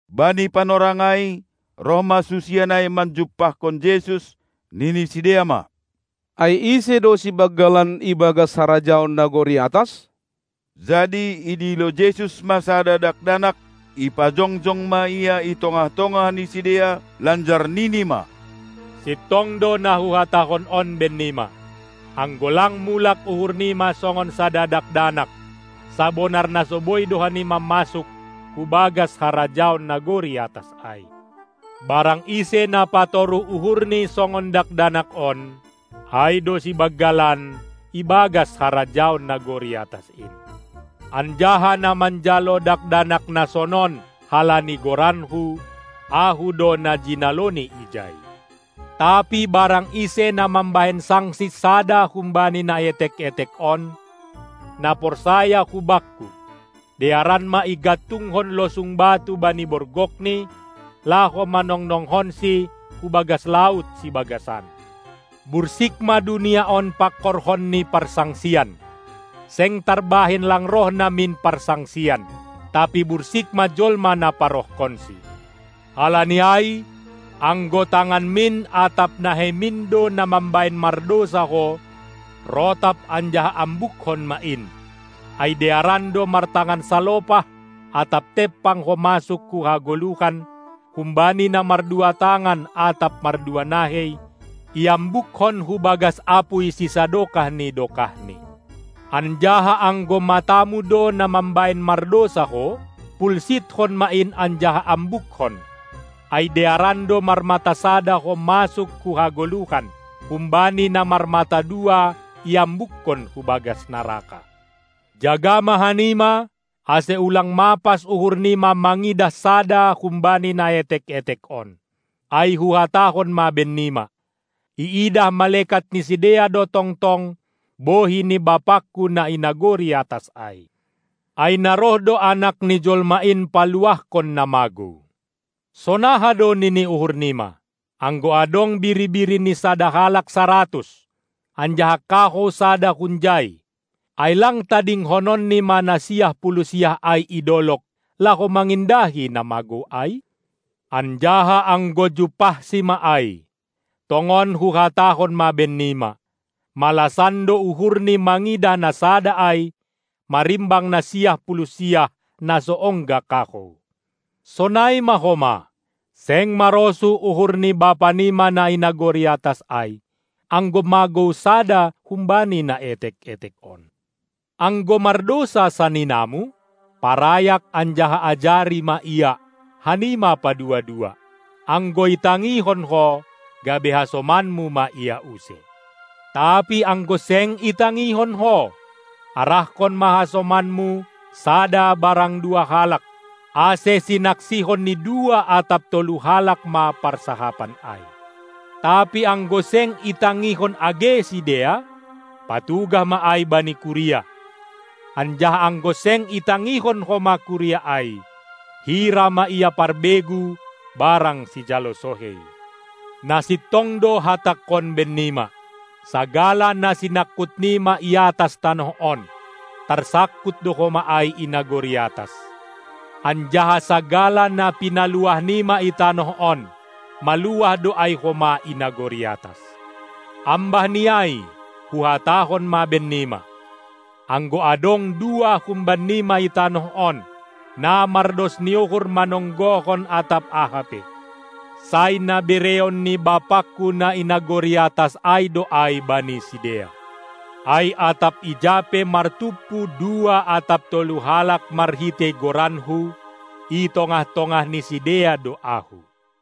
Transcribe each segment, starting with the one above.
Bani panorang ai, roh ma susian ai manjumpahkon Jesus, nini sidea ma: Ai ise do sibanggalan ibagas harajaon nagori atas? Jadi idilo Jesus ma sada dakdanak, ipajongjong ma ia i tongah-tongah ni sidea, lanjar nini ma: Sintong do na Huhatahon on bennima: Anggo lang mulak uhurnima songon sada dakdanak, sabonar na so boi do hanima masuk hu bagas harajaon nagori atas ai. Barang ise na patoruh uhurni songon dakdanak on, ai do sibanggalan ibagas harajaon nagori atas in. Anjaha na manjalo dakdanak na sonon, halani goranKu, Ahu do na jinaloni ijai. Tapi barang ise na mambahen sangsi sada humbani na etek-etek on, na porsaya hu Bakku, dearan ma igantungkon losung batu bani borgokni, laho mannongnongkonsi hu bagas laut sibagasan. Bursik ma dunia on pangkorhon ni parsangsian! Seng tarbahen lang roh namin parsangsian, tapi bursik ma jolma na parohkonsi! Halani ai, anggo tanganmin atap naheimin do na mambahen mardousa ho, rotap anjaha ambukkon ma in, ai dearan do martangan salopah atap tempang ho masuk hu hagoluhan, humbani na mardua tangan atap mardua nahei iambukkon hu bagas apuy sisadokah ni dokahni. Anjaha anggo matamu do na mambahen mardousa ho, pulsitkon ma in anjaha ambukkon, ai dearan do marmata sada ho masuk hu hagoluhan, humbani na marmata dua iambukon hu bagas naraka. Jaga ma hanima, ase ulang mapas uhurnima mangidah sada humbani na etek-etek on. Ai Huhatahon ma bennima: Iidah malekat ni sidea do tongtong bohi ni BapangKu na i nagori atas ai. (Ai na roh do Anak ni jolma in paluahkon na magou). Sonaha do nini uhurnima? Anggo adong biri-biri ni sada halak saratus, anjaha kahou sada hunjai, ai lang tadingkononni ma na siah puluh siah ai i dolog, laho mangindahi na magou ai? Anjaha anggo jumpahsi ma ai, tongon Huhatahon ma bennima, malasan do uhurni mangidah na sada ai marimbang na siah puluh siah, na so ongga kahou. Sonai ma homa seng marosuh uhur ni Bapanima na i nagori atas ai, anggo magou sada humbani na etek-etek on. Anggo mardousa saninamu, parayak anjaha ajari ma ia, hanima padua-dua. Anggo itangihon ho, gabe hasomanmu ma ia use. Tapi anggo seng itangihon ho, arahkon ma hasomanmu sada barang dua halak, ase sinaksihon ni dua atap tolu halak ma parsahapan ai. Tapi anggo seng itangihon age sidea, patugah ma ai bani kuria; anjaha anggo seng itangihon homa kuria ai, hira ma ia parbegu barang sijalo sohei. Na sintong do Hatangkon bennima: Sagala na sinangkutnima i atas tanoh on, tarsangkut do homa ai i nagori atas, anjaha sagala na pinaluahnima i tanoh on, maluah do ai homa i nagori atas. Ambahni ai Huhatahon ma bennima: Anggo adong dua humbannima i tanoh on, na mardos ni uhur manonggohon atap aha pe, sai na bereon ni BapangKu na i nagori atas ai do ai bani sidea. Ai atap ija pe martumpu dua atap tolu halak marhitei goranKu, i tongah-tongah ni sidea do Ahu.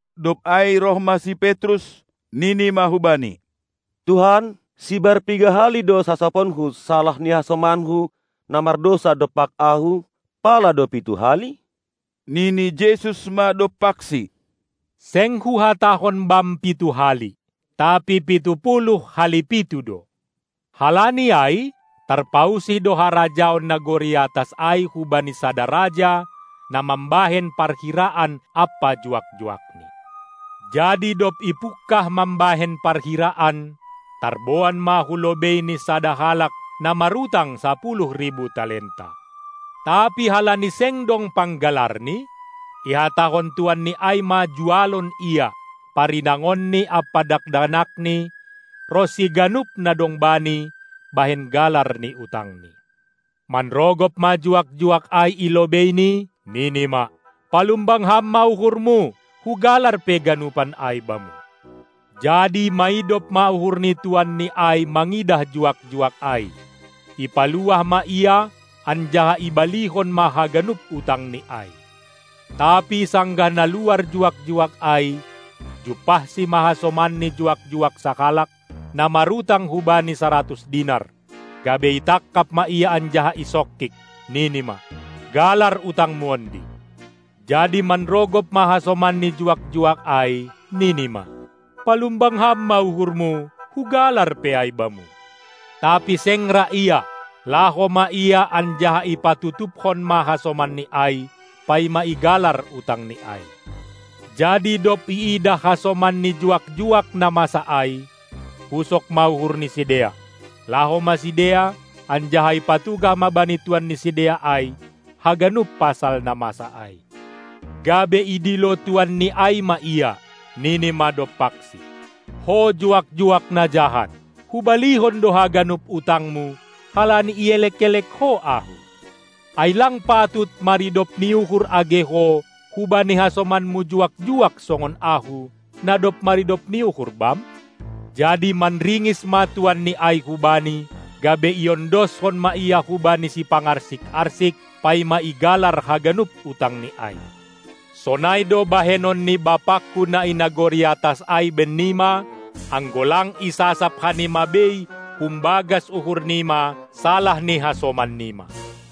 Dob ai roh ma si Petrus, nini ma hubani: Tuhan, sibar piga hali do sasaponku salah ni hasomanku, na mardousa dompak ahu? Pala do pitu hali? Nini Jesus ma dompaksi: Seng Huhatahon bam pitu hali, tapi pitu puluh hali pitu do. Halani ai tarpausih do harajaon nagori atas ai hubani sada raja na mambahen parhiraan ampa juak-juakni. Jadi dob ipungkah mambahen parhiraan, tarboan ma hu lobeini sada halak, na marutang sapuluh ribu talenta. Tapi halani seng dong panggalarni, ihatahon tuanni ai ma jualon ia, parinangonni ampa dakdanakni ronsi ganup na dong bani, bahen galar ni utangni. Manrogop ma juak-juak ai i lobeini, nini ma: Palumbang ham ma uhurmu, hugalar pe ganupan ai bamu! Jadi maidop ma uhur ni tuanni ai mangidah juak-juak ai, ipaluah ma ia anjaha ibalihon ma haganup utangni ai. Tapi sanggah na luar juak-juak ai, jumpahsi ma hasomanni juak-juak sahalak, na marutang hubani saratus dinar, gabe itangkap ma ia anjaha isongkik, nini ma: Galar utangmu ondi! Jadi manrogop ma hasomanni juak-juak ai, nini ma: Palumbang ham ma uhurmu, hugalar pe ai bamu! Tapi seng ra ia, laho ma ia anjaha ipatutupkon ma hasomanni ai, paima igalar utangni ai. Jadi dob iidah hasomanni juak-juak na masa ai, pusok ma uhur ni sidea, laho ma sidea, anjaha ipatugah ma bani tuan ni sidea ai haganup pasal na masa ai. Gabe idilo tuanni ai ma ia, nini ma dompaksi: Ho juak-juak na jahat! Hubalihon do haganup utangmu, halani ielek-elek ho ahu. Ai lang patut maridop ni uhur age ho hubani hasomanmu juak-juak songon ahu, na dob maridop ni uhur bam? Jadi marringis ma tuanni ai hubani, gabe iondoskon ma ia hubani sipangarsik-arsik, paima igalar haganup utangni ai. Sonai do bahenon ni BapangKu na i nagori atas ai bennima, anggo lang isasap hanima bei humbagas uhurnima salah ni hasomannima.